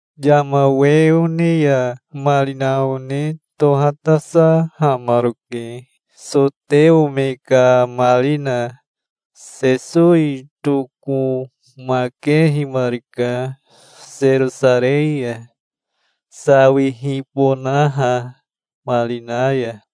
Yama we one ya marina one tohatasahamaroke, soteo me ka marina. Sesowi tokomakehimarika Serosarei ya, sawihibonaha marina ya.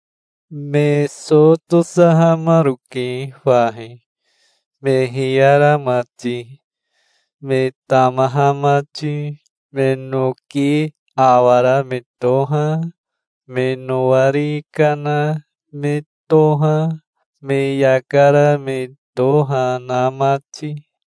Me so tosahamaroke fahi, me hiyara mati, me tamaha mati, me noki awara me toha, me nowari kana me toha, me yaka ra me toha na mati.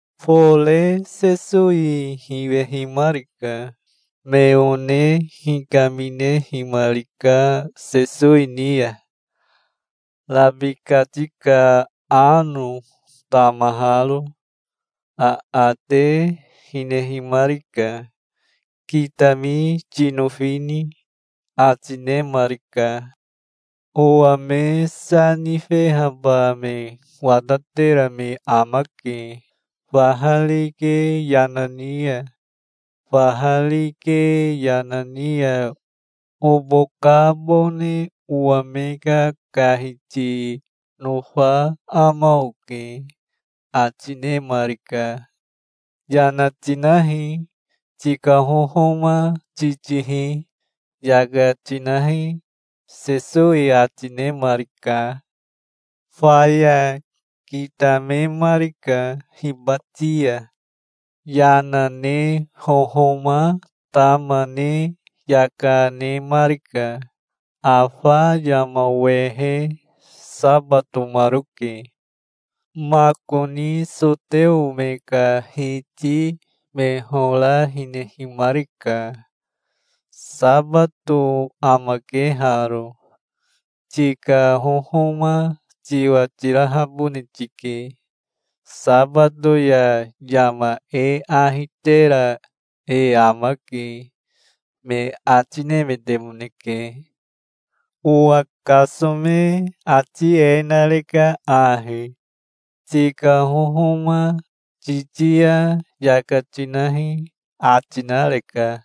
Fore Sesowi hiwehimarika. Me one hikaminehimarika Sesowi ni ya, rabikati ka ano tamaharo. Aate hinehimarika. "Kitami tinofini?" ati nemarika. "Owa me sa nifehaba me watatera me amake, faha rike yana ni ya. Faha rike yana ni ya obokabone owa me kakahiti nofa ama oke", ati nemarika. "Yana tinahi. Tika hohoma titihi. Yaka tinahi", Sesowi ati nemarika. Faya kitamemarika hibati ya. Yana ne hohoma tama ne yaka nemarika. Afa yama wehe sabatomaroke. Makoni soteo me ka hiti me hora hinehimarika. "Sabato amake haro. Tika hohoma tiwa tirahabone tike. Sabato ya yama e ahi tera e amake", me ati nemetemoneke. "Owa kasome ati e nareka ahi: 'Tika hohoma titi ya yaka tinahi', ati nareka".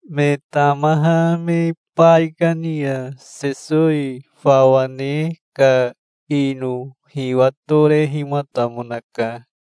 Me tamaha me baikani ya Sesowi fawa ne ka ino hiwatorehimatamonaka.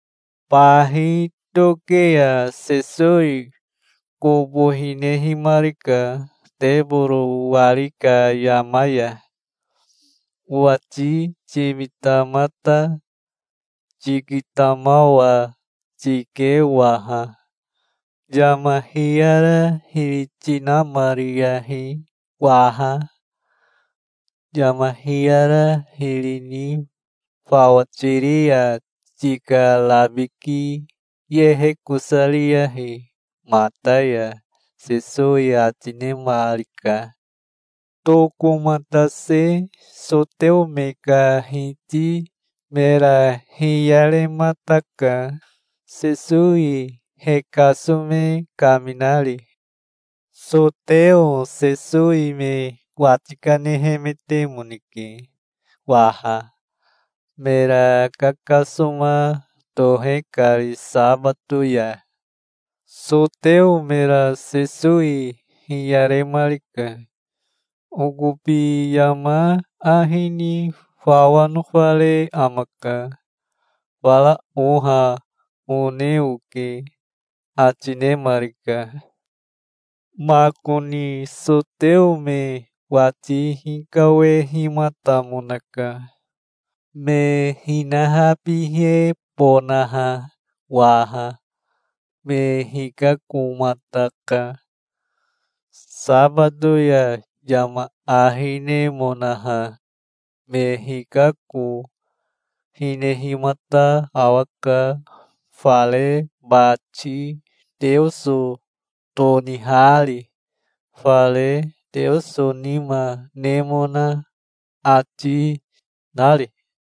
Bahi toke ya Sesowi kobo hinehimarika teboro wari ka yama ya. "Owati timita mata. Tikitamawa tike waha. Yama hiyara hiri tinamariyahi waha. Yama hiyara hiri ni fawa tiri ya tika rabiki yehekosariyahi mata ya", Sesowi ati nemarika. Tokomatase soteo me ka hiti mera hiyaremataka, Sesowi he kasome kaminari. Soteo Sesowi me wati kanehemetemoneke waha, mera kakasoma tohe kari sabato ya. Soteo mera Sesowi hiyaremarika. "Okobi yama ahi ni fawa nofare amaka. Fara oha one oke", ati nemarika. Makoni soteo me wati hikawehimatamonaka, me hinahabihebonaha waha. Me hikakomataka, sabato ya yama ahi nemonaha. Me hikako, hinehimata awaka, fare bati Teoso tonihari, fare Teoso nima nemona ati, nari.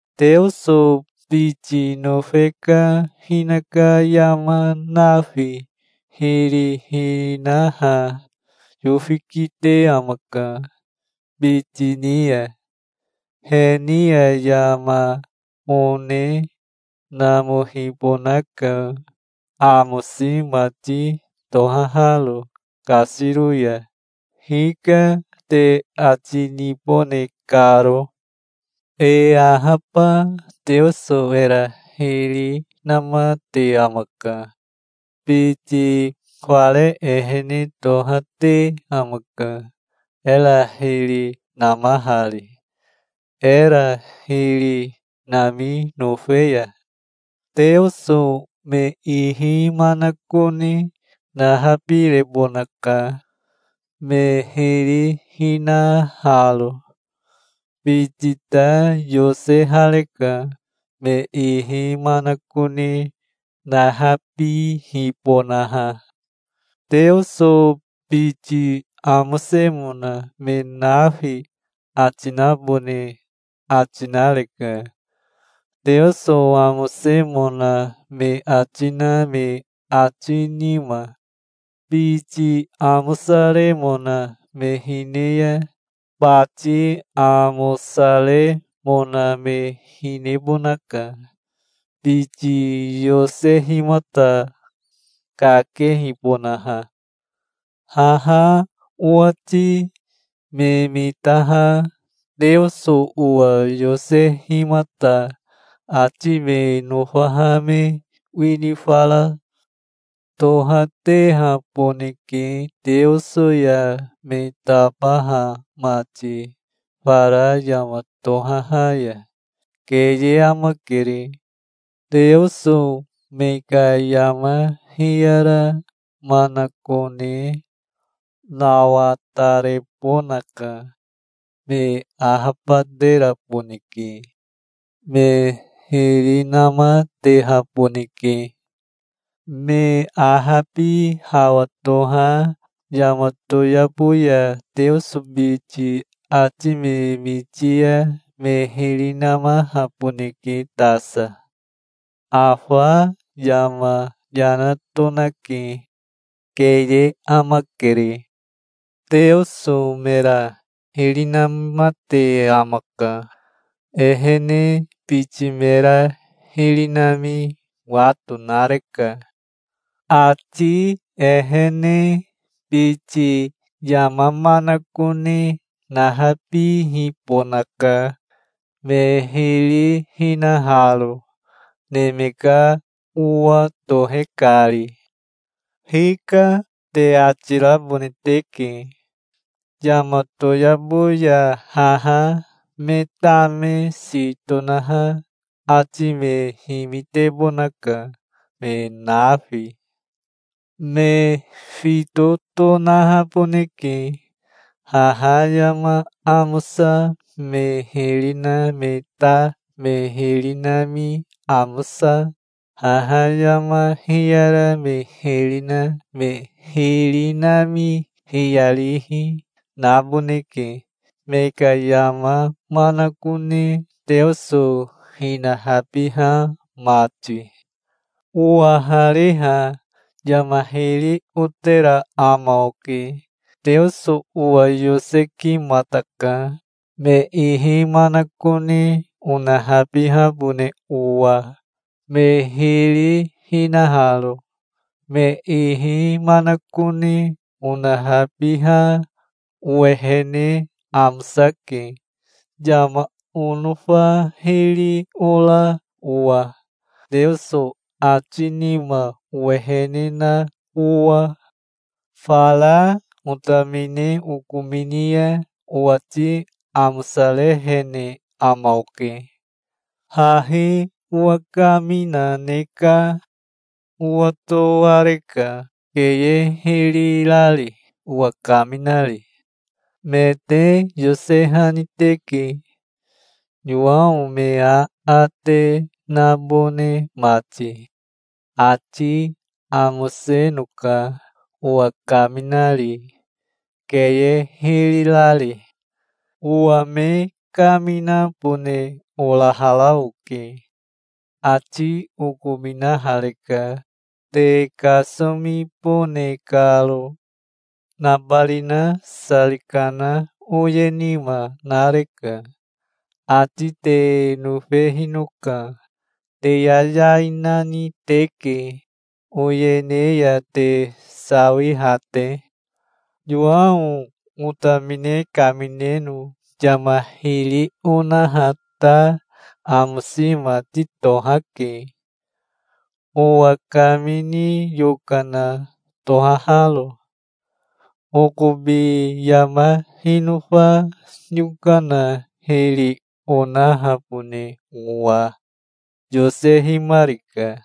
Teoso biti nofe ka hinaka yama nafi hiri hinaha yofi kite amaka, biti ni ya. He ni ya yama one namohibonaka, amosi mati tohaharo kasiro ya, 'Hika', te ati nibone karo. E ahaba Teoso era hiri namate amaka. Biti fare ehene toha te amaka, era hiri namahari, era hiri nami nofe ya. Teoso me ihi manakone nahabirebonaka, me hiri hinaharo. Biti ta yosehareka, me ihi manakone nahabihibonaha. Teoso biti amosemona me nafi ati nabone ati nareka, Teoso amosemona me ati na me ati nima. Biti amosaremona me hine ya, bati amosaremona me hinebonaka, biti yosehimata, kakehibonaha. Haha owati me mitaha Teoso owa yosehimata ati me nofaha me wini fara tohatehaboneke Teoso ya me tabaha mati fara yama tohaha ya. Keye amakere. Teoso me ka yama hiyara manakone nawatarebonaka. Me ahabateraboneke. Me hiri namatehaboneke. Me ahabi hawa toha yama toyabo ya Teoso biti ati me miti ya me hiri namahaboneke tasa. Afa yama yana tonake. Keye amakere. Teoso mera hiri namate amaka. Ehene biti mera hiri nami wato nareka. Ati ehene biti yama manakone nahabihibonaka, me hiri hinaharo, Neme ka Owa tohe kari. 'Hika', te ati rabone teke. Yama toyabo ya haha me tame si tonaha ati me himitebonaka, me nafi. Me fito tonahaboneke. Haha yama amosa me hiri na me ta me hiri nami amosa, haha yama hiyara me hiri na me hiri nami hiyarihi, naboneke, me ka yama manakone Teoso hinahabiha mati". "Owahariha yama hiri otera ama oke. Teoso owa yosekimataka, me ihi manakone onahabihabone owa, me hiri hinaharo. Me ihi manakone onahabiha owehene amosake, yama onofa hiri ora owa, Teoso ati nima owehene na owa". "Fara otamine okomini ya owati amosarehene ama oke. Hahi owa kamina ne naka. Owatoareka keye hiri rari, owa kaminari. Me te yosehani teke, Yowao me aate nabone mati. Ati amosenoka owa kaminari, keye hiri rari. Owa me kaminabone orahara oke. Ati okominahareka, te kasomibone karo. Nabarina sari kana oye nima nareka. Ati te nofehinoka. Te yayai nani teke, oyene ya te sawiha te. Yowao otamine kamineno yama hiri onaha ta amosi mati tohake, owa kamini yokana tohaharo. Okobi yama hinofa yokana hiri onahabone owa yosehimarika,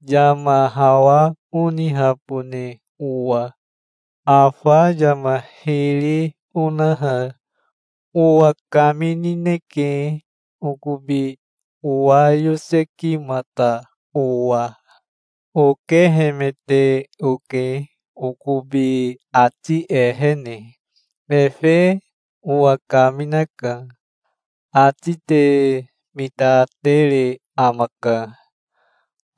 yama hawa onihabone owa. Afa yama hiri onaha owa kaminineke, okobi owa yosekimata owa. Okehemete oke okobi ati ehene. Efe owa kaminaka. Ati te mitatere amaka.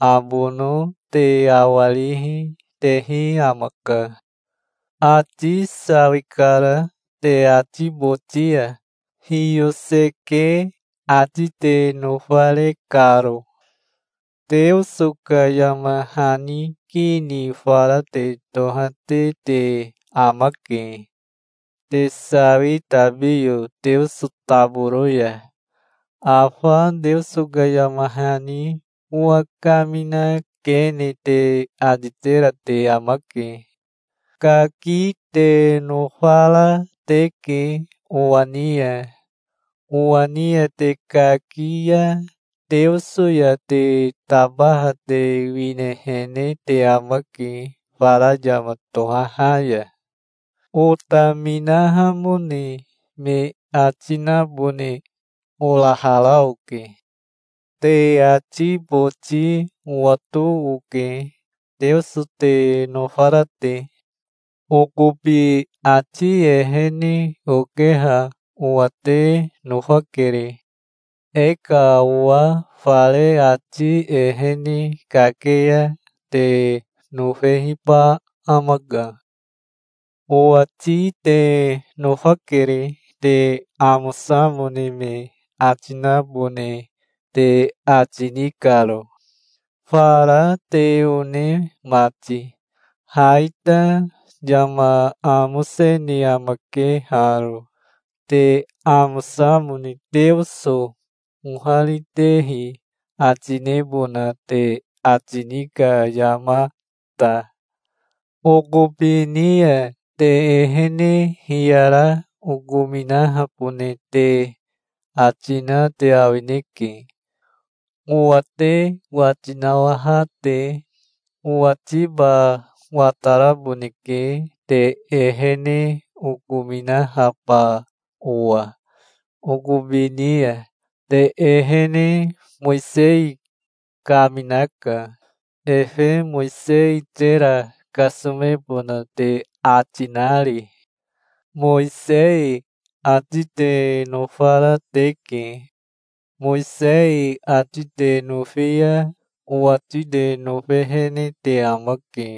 Abono te awarihi tehi amaka. Ati sawikara te ati boti ya, hiyoseke ati te nofare karo. Teoso ka yama hani ki ni fara te tohate te amake, te sawi tabiyo Teoso taboro ya. Afa Teoso ka yama hani owa kamina kene te ati tera te amake. Kaki te nofara teke owa ni ya. Owa ni ya te kaki ya Teoso ya te tabaha te winehene te amake fara yama tohaha ya". "Otaminahamone me ati nabone orahara oke. Te ati boti owato oke, Teoso te nofara te. Okobi ati ehene okeha owa te nofakere. E ka owa fare ati ehene kake ya te nofehiba amaka. Owati te nofakere, te amosamone me ati nabone te ati ni karo, fara te one mati. Ha ita yama amosene amake haro, te amosamone Teoso oharitehi ati nebona te ati ni ka yama ta. Okobi ni ya te ehene hiyara okominahabone te ati na te awineke, owa te wati nawaha te. Owatiba wataraboneke te ehene okominahaba owa okobi ni ya. Te ehene Mowisei kaminaka, efe Mowisei tera kasomebona te ati nari. Mowisei ati te nofara teke. Mowisei ati te nofi ya owati te nofehene te amake.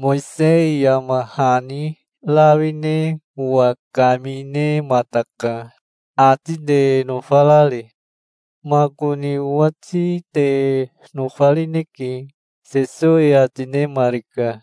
Mowisei yama hani rawi ne owa kaminemataka, ati te nofarari. Makoni owati te nofarineke", Sesowi ati nemarika.